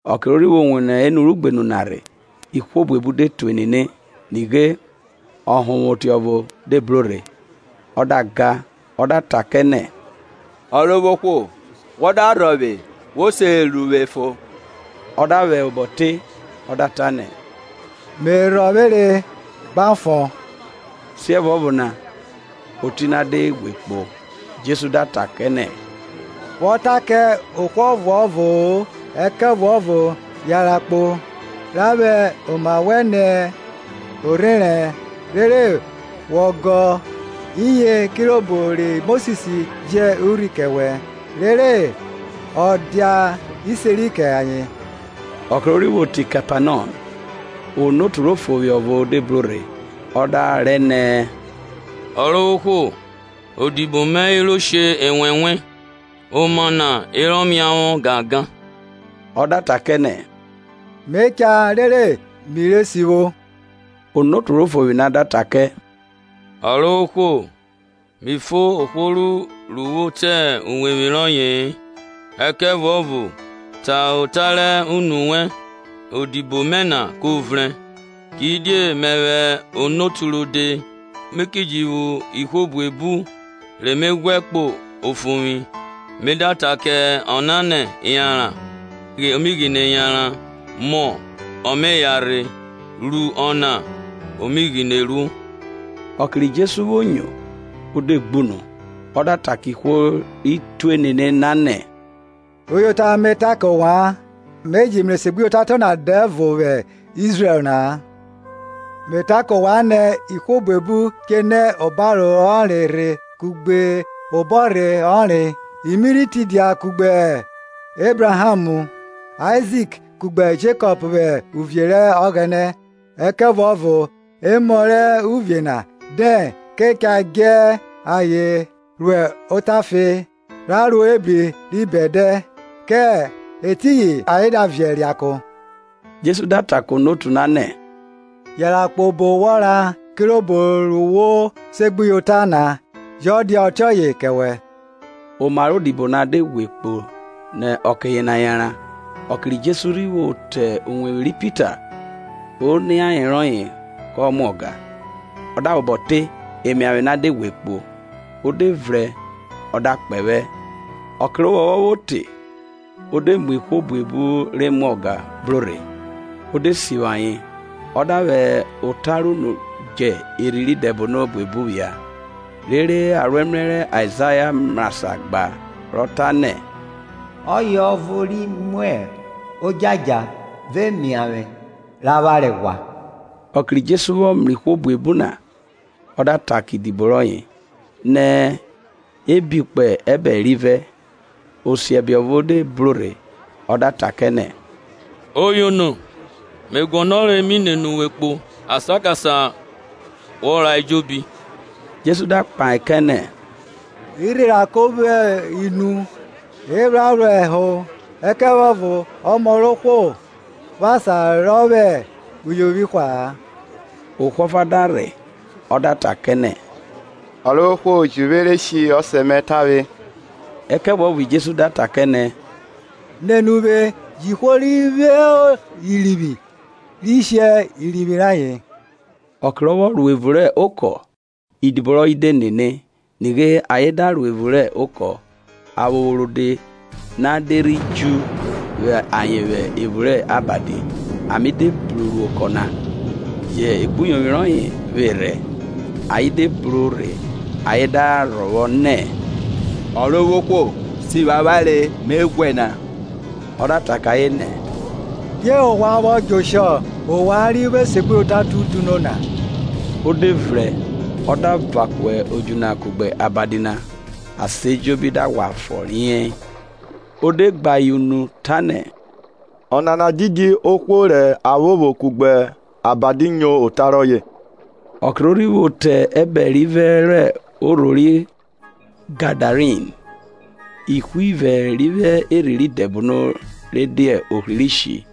Ọke ro rhi vwo wo nẹ enu rẹ ugbenu na rhe, ihwo buebu de tue nene. Nighe, ọhonvwoti ọvo de bro rhe, ọ da ga, ọ da ta kẹ nẹ, Ọrovwohwo, wọ da rhọvwe, wo se ru vwe fon. Ọ da vwẹ obọ te, ọ da ta nẹ, me rhọvwere gba fon. Siẹvuọvo na oti na de ghwe kpo. Jesu da ta kẹ nẹ, Wọ ta kẹ ohwo ọvuọvo-o, ẹkẹvuọvo yanran kpo, ra vwẹ oma wẹn nẹ orherẹn, rere wọ gọ iye kirobo ri Mosis ji urhi kẹ wẹ, rere o dia iseri kẹ ayen. Ọke ro rhi vwo te Kepanọm, onotu rẹ ofovwi ọvo de bro rhe, ọ da rẹ nẹ, Ọrovwohwo, odibo mẹ hiro she enwẹnwẹ, oma na herọ miavwọ gangan. Ọ da ta kẹ nẹ, me cha rere mi re sivwo. Onotu rẹ ofovwi na da ta kẹ, Ọrovwohwo, mi fo ohwo ru wo te uwevwi rọye-e, ẹkẹvuọvo ta ota rẹ unu wẹn, odibo mẹ na ko vrẹn. Kidie mẹvwẹ onotu rode, mi ki ji vwo ihwo buebu re me ghwẹ kpo ofovwi; me da ta kẹ ọna nẹ, yanran, ọ me ghene yanran, mọ, ọ me yanrhe: ta kẹ ọviẹ mẹ, ru ọna, o mi ghine ruo. Ọke ri Jesu vwo nyo, ọ de gbunu, ọ da ta kẹ ihwo ri tue nene na nẹ, Uyota me ta kẹ ovwan, Me je mrẹ esegbuyota tiọna dẹvo vwẹ Izrẹl na-a. Me ta kẹ ovwan nẹ, ihwo buebu che nẹ obaro ọnre rhe kugbe obọrhe ọnre, i mi rhi tidia kugbe Ebraham, Aizik kugbe Jekọp vwẹ uviẹ rẹ Ọghẹnẹ. Ẹkẹvuọvo emọ rẹ uvie na dẹn ka cha djẹ ayen ro otafe, ra ro ebri ri hwin. Kẹ etiyin ayen da viẹ da re ako. Jesu da ta kẹ onotu na nẹ, Yanran kpo obo wọ ra, kirobo ru wo segbuyota na jọ dia ọtiọye kẹ wẹ; oma rẹ odibo na de ghwe kpo nẹ ọke yena yanran. Ọke ri Jesu rhi vwo te uwevwi ri Pita, oniaye rọye kọ mwa ọga. Ọ da vwẹ obọ te, emiavwe na de ghwe kpo; o de vrẹn o de gbe odibo kẹ. Ọkẹ rẹ ovwọnvwọn vwo te, e de mu ihwo buebu re mwa ọga bro rhe, ọ de sivwi ayen, ọ da vwẹ ota rẹ unu djẹ erhi rẹ idẹbono buebu phia. Rere aroẹmrẹ rẹ Aizaya vwọ mrasan gba, ro ta nẹ, Ọye mu odjadja vẹ emiavwe rẹ avwanre ghwa. Ọke ri Jesu vwọ mrẹ ihwo buebu na, ọ da ta kẹ idibo rọyẹ, nẹ, e bi kpo ẹbẹre rivẹ. Osiọbe ọvo de bro rhe, ọ da ta kẹ nẹ, Oyono, me guọnọre mi nene uwe kpo asan kasan re wọ ra ejobi. Jesu da kpahe kẹ nẹ, irhirako vwo mu, ephran vwo ẹho, ẹkẹvuọvo ọmọ rẹ ohwo vwo asan rọ vwẹ uyovwi hwa-a. Ohwo ọfa da rhe, ọ da ta kẹ nẹ, Ọrovwohwo, ji vwe re shi ọsẹ mẹ tavwe. Ẹkẹvuọvo Jesu da ta kẹ nẹ, nene uvwe; jẹ ihwo ri vwo orivwi re shi orivwi rayen. Ọke rọ vwọ ro evun rẹ okọ, idibo rọye de nene. Nighe ayen da ro evun rẹ okọ, aphopho rode na de rhi dju vwa ayen vwẹ evun rẹ abadi, ame de bru ro okọ na, yẹ ekpuyovwi rọye vwerhẹ. Ayen de bro rhe, ayen da rhọvwọ nẹ, Ọrovwohwo, sivwi avwanre me ghwẹ na. Ọ da ta kẹ ayen nẹ, die ovwan vwọ djẹ oshọ, ovwan ri vwo esegbuyota tutuno na? Ọ de vrẹn, ọ da van ku odju na kugbe abadi na, asan ejobi da ghwa fọ riei. Ọ de gbe ayen unu ta nẹ, ọna didi ohwo rẹ aphopho kugbe abadi nyo ota rọye? Ọke ro rhi vwo te ẹbẹre rivẹ rẹ orho ri Gadarin, ihwo ivẹ ri vwo erhi rẹ idẹbono re dia ohri rẹ ishi,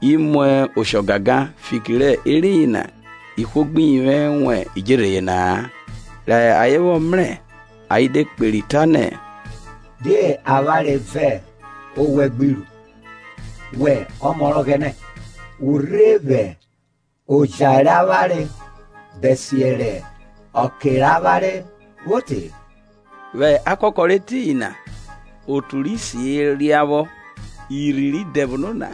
i mu osho gangan, fiki rẹ eriyin na ihwo gbi yivwẹ wan idjerhe yena-a. Rẹ ayen vwọ mrẹ, ayen de kperi ta nẹ, Die avwanre vẹ owẹ gbi ru, wẹ Ọmọ rẹ Ọghẹnẹ? Wọ rhe vwẹ oja re avwanre bẹsiẹ rẹ ọke rẹ avwanre vwo te? Vwẹ akakọ rẹ etiyin na, otu rẹ isi herọ ria emu vwọ. Irhi rẹ idẹbono na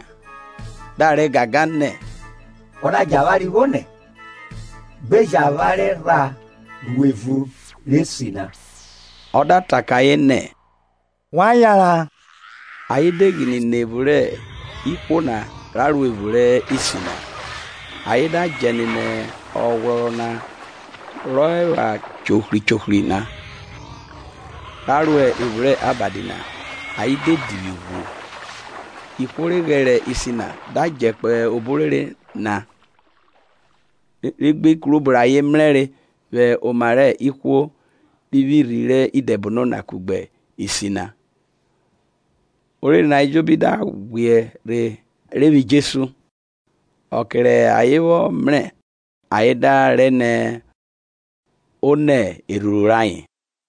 da rẹ gangan nẹ, Wọ da djẹ avwanre vwonẹ, gbe jẹ avwanre ra ro evun rẹ isi na. Ọ da ta kẹ ayen nẹ, Wan yanran, ayen de ghine nẹ evun rẹ ihwo na ra ro evun rẹ isi na; ayen da djẹ nene oghwrọrọ na rọ epha chohri chohri na, ra ro evun rẹ abadi na, ayen de divwi ghwu. Ihwo re ghẹrẹ isi na da djẹ kpo obo orere na, rẹ gbe ikun rẹ obo rẹ ayen mrẹre vwẹ oma rẹ ihwo ri vwo irhi rẹ idẹbono na kugbe isi na. Orere na ejobi da ghwiẹ rhe rhe vwa Jesu: ọke rẹ ayen vwọ mrẹ ayen da rẹ nẹ o nẹ erhuru rayen.